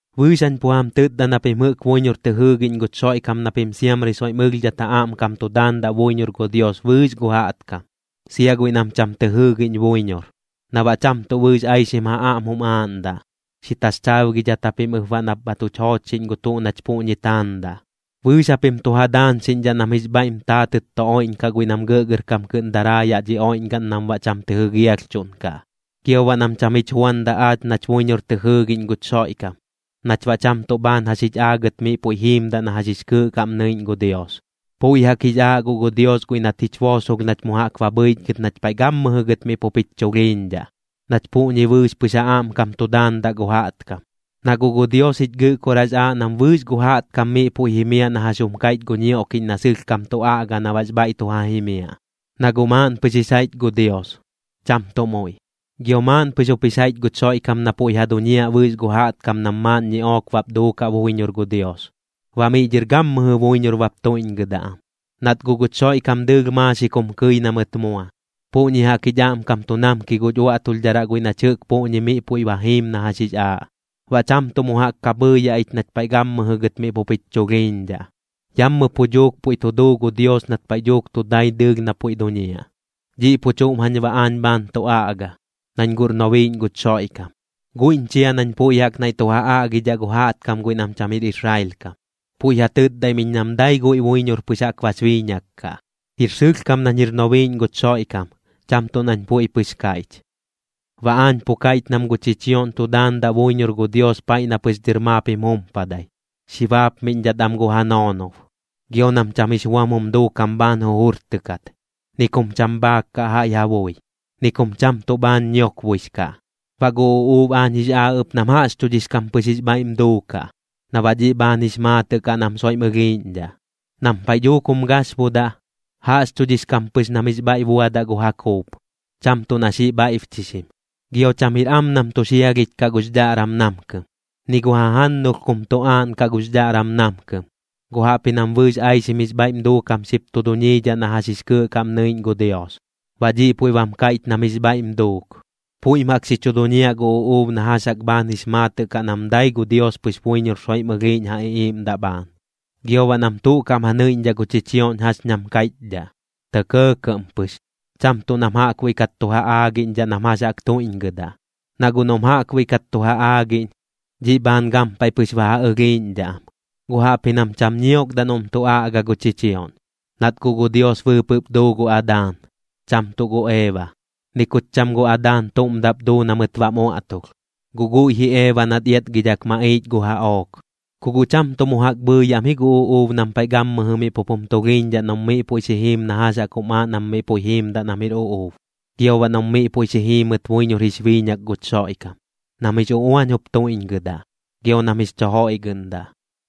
Bɨɨx jañ pu jam tɨtda na pim jɨꞌk buiñor tɨ jɨɨgiꞌñ guch Xoiꞌkam na pim siamri soiꞌm ɨlhdhat ja aꞌmkam tu daandaꞌ buiñor gu Dios bɨɨx gu jaꞌtkam, sia guiꞌ nam cham tɨ jɨɨgiꞌñ buiñor, na baꞌ cham tuꞌ bɨɨx aixim ja aꞌm jum aaꞌndaꞌ. Xi taxchaabgidhat japim ɨp baꞌ na bha tuch joochxiꞌñ gu tuꞌ nach puꞌñi taandaꞌ. Bɨɨx japim tu ja daañxiꞌñdhaꞌ nam jix bhaiꞌm taatɨt tu oiꞌñkaꞌ guiꞌ nam gɇꞌgɇrkam kɨꞌn daraa yaꞌ dhi oiꞌñgaꞌn nam baꞌ cham tɨ jɨgialhchuꞌnkaꞌ, gio baꞌ nam cham jich juandaꞌ aach nach buiñor tɨ jɨɨgiꞌñ guch Xoiꞌkam, nach baꞌ cham tuꞌ bhaan jax jich aagɨt miꞌ puiꞌ jiimdaꞌ na jax jix kɨɨꞌ kaꞌm nɨiꞌñ gu Dios. Puiꞌ jaꞌk jix aaꞌ guꞌ gu Dios guiꞌ nat jich boosolh nach mu jaꞌk ba bhɨichgɨt nach paiꞌ gammɨjɨ gɨt miꞌ pup jich chulhiiñdhaꞌ, nach puꞌñi bɨɨx pɨx ja aꞌmkam tu daandaꞌ gu jaꞌtkam. Na guꞌ gu Dios jich Gɨꞌkoraꞌx aaꞌ nam bɨɨx gu jaꞌtkam miꞌ puiꞌ jimiaꞌ na jax jum kaiꞌch gu ñioꞌkiꞌñ na sɨlhkam tu aꞌga na baꞌx bhaiꞌ tu ja jimiaꞌ. Na guꞌ maaꞌn pɨx jix jaiꞌch gu Dios, cham tuꞌ muiꞌ. Gio maaꞌn pɨx jup jix jaiꞌch guch Xoiꞌkam na puiꞌ ja duñiaꞌ bɨɨx gu jaꞌtkam nam maaꞌn ñiꞌook bap duukaꞌ buiñor gu Dios, baꞌ miꞌ dhɨr gammɨjɨ buiñor bap tuiꞌñgɨdaꞌ am. Nat guꞌ guch Xoiꞌkam dɨɨlh maaxik jum kɨi na mɨt mua, puꞌñi jaꞌk jich aꞌmkam tu namki guch uaꞌtulhdharaꞌ guiꞌ nach jɨꞌk puꞌñi miꞌ puiꞌ jiim na jax jix aaꞌ, baꞌ cham tuꞌ mu jaꞌk ka bhɨɨyaꞌ ich nach paiꞌ gammɨjɨ gɨt miꞌ pup jich chulhiiñdhaꞌ. Yammɨ pu dhuuk puiꞌ tu duu gu Dios nat paiꞌ dhuuk tu dai dɨɨlh na puiꞌ duñiaꞌ. Dhiꞌ pu chuꞌm jañ baꞌ aañ bhaan tu aꞌga, nañ guꞌr nobiiꞌñ guch Xoiꞌkam. Guiꞌñ chia nañ puiꞌ jaꞌk naiꞌ tu ja aꞌgidhaꞌ gu jaꞌtkam guiꞌ nam cham jir Israel kam, puiꞌ ja tɨtdaim iñ nam dai guiꞌ buiñor pɨx jaꞌk bax biiñak kaꞌ. Jir sɨlhkam nañ jir nobiiꞌñ guch Xoiꞌkam, cham tuꞌ nañ puiꞌ pɨx kaiꞌch. Baꞌ aañ pu kaiꞌch nam gu chichioꞌñ tu daandaꞌ buiñor gu Dios paiꞌ na pɨx dhɨr maap jim jumpadai, xi baapmiꞌñdhat am gu ja noonob, gio nam cham jix buam jum duukam bhaan jujurtɨkat, ni kum cham bhaak kaꞌ jaiꞌ ja bui, ni kum cham tuꞌ bhaan ñiokboix kaꞌ. Baꞌ gu uꞌuub aañ jix aaꞌ ɨp nam jaꞌxchudhix kam pɨx jix bhaiꞌm duukaꞌ, na baꞌ dhiꞌ bhaan jix maatɨꞌ kaꞌ nam soiꞌm ɨlhiiꞌñdhaꞌ. Nam paiꞌ dhuuk jum gaxbudaꞌ, jaꞌxchudhix kam pɨx nam jix bhaiꞌ buadaꞌ gu ja kuup, cham tuꞌ na xiꞌ bhaiꞌbchixim. Gio cham jir am nam tu xialhich kaꞌ gux dhaꞌram namkɨm, ni gu jajannulh kum tu aaꞌnkaꞌ gux dhaꞌram namkɨm. Guꞌ jaꞌpji nam bɨɨx aixim jix bhaiꞌm duukam xip tu duñiidhaꞌ na jax jix kɨɨꞌ kaꞌm nɨiꞌñ gu Dios, baꞌ dhiꞌ puiꞌ bam kaiꞌch nam jix bhaiꞌm duuk. Puiꞌm jaꞌk xi chu duñiaꞌ gu uꞌuub na jax jaꞌk bhaan jix maatɨꞌ kaꞌ nam dai gu Dios pɨx buiñor soiꞌm ɨlhiiꞌñ ja iꞌiiꞌmdaꞌ bhaan. Gio baꞌ nam tuꞌ kaꞌm ja nɨiꞌñdhaꞌ gu chichioꞌñ jax ñam kaiꞌchdhaꞌ, tɇ kɇɇkɇꞌm pɨx, cham tuꞌ nam jaꞌkbuiꞌ kat tu ja aagiꞌñdhaꞌ nam jax jaꞌk tuiꞌñgɨdaꞌ. Na guꞌ noꞌm jaꞌkbuiꞌ kat tu ja aagiꞌñ, dhiꞌ bhaan gampaiꞌ pɨx ba ja ɨlhiiꞌñdhaꞌ am, guꞌ jaꞌpji nam cham ñiokdaꞌ noꞌm tu aꞌga gu chichioꞌñ. Nat guꞌ gu Dios bɨɨpɨꞌp duu gu Adaan, cham tuꞌ gu Eeba. Ni kut cham gu Adaan tuꞌm daꞌp duu na mɨt baꞌm uaꞌtulh, guꞌ guiꞌ ji Eeba nat iatgidhak maꞌiich gu jaꞌook. Ku guꞌ cham tuꞌ mu jaꞌk bhɨɨyaꞌm ji gu uꞌuub nam paiꞌ gammɨjɨ miꞌ pup jum tulhiiñdhaꞌ noꞌm miꞌ puiꞌ xi jiim na jax jaꞌk jum aaꞌ nam miꞌ puiꞌ jiimdaꞌ nam jir uꞌuub, gio baꞌ noꞌm miꞌ puiꞌ xi jiimɨt buiñor jix biiñak guch Xoiꞌkam, nam jix uꞌuañ jup tuiꞌñgɨdaꞌ, gio nam jix chu joiꞌgɨꞌndaꞌ.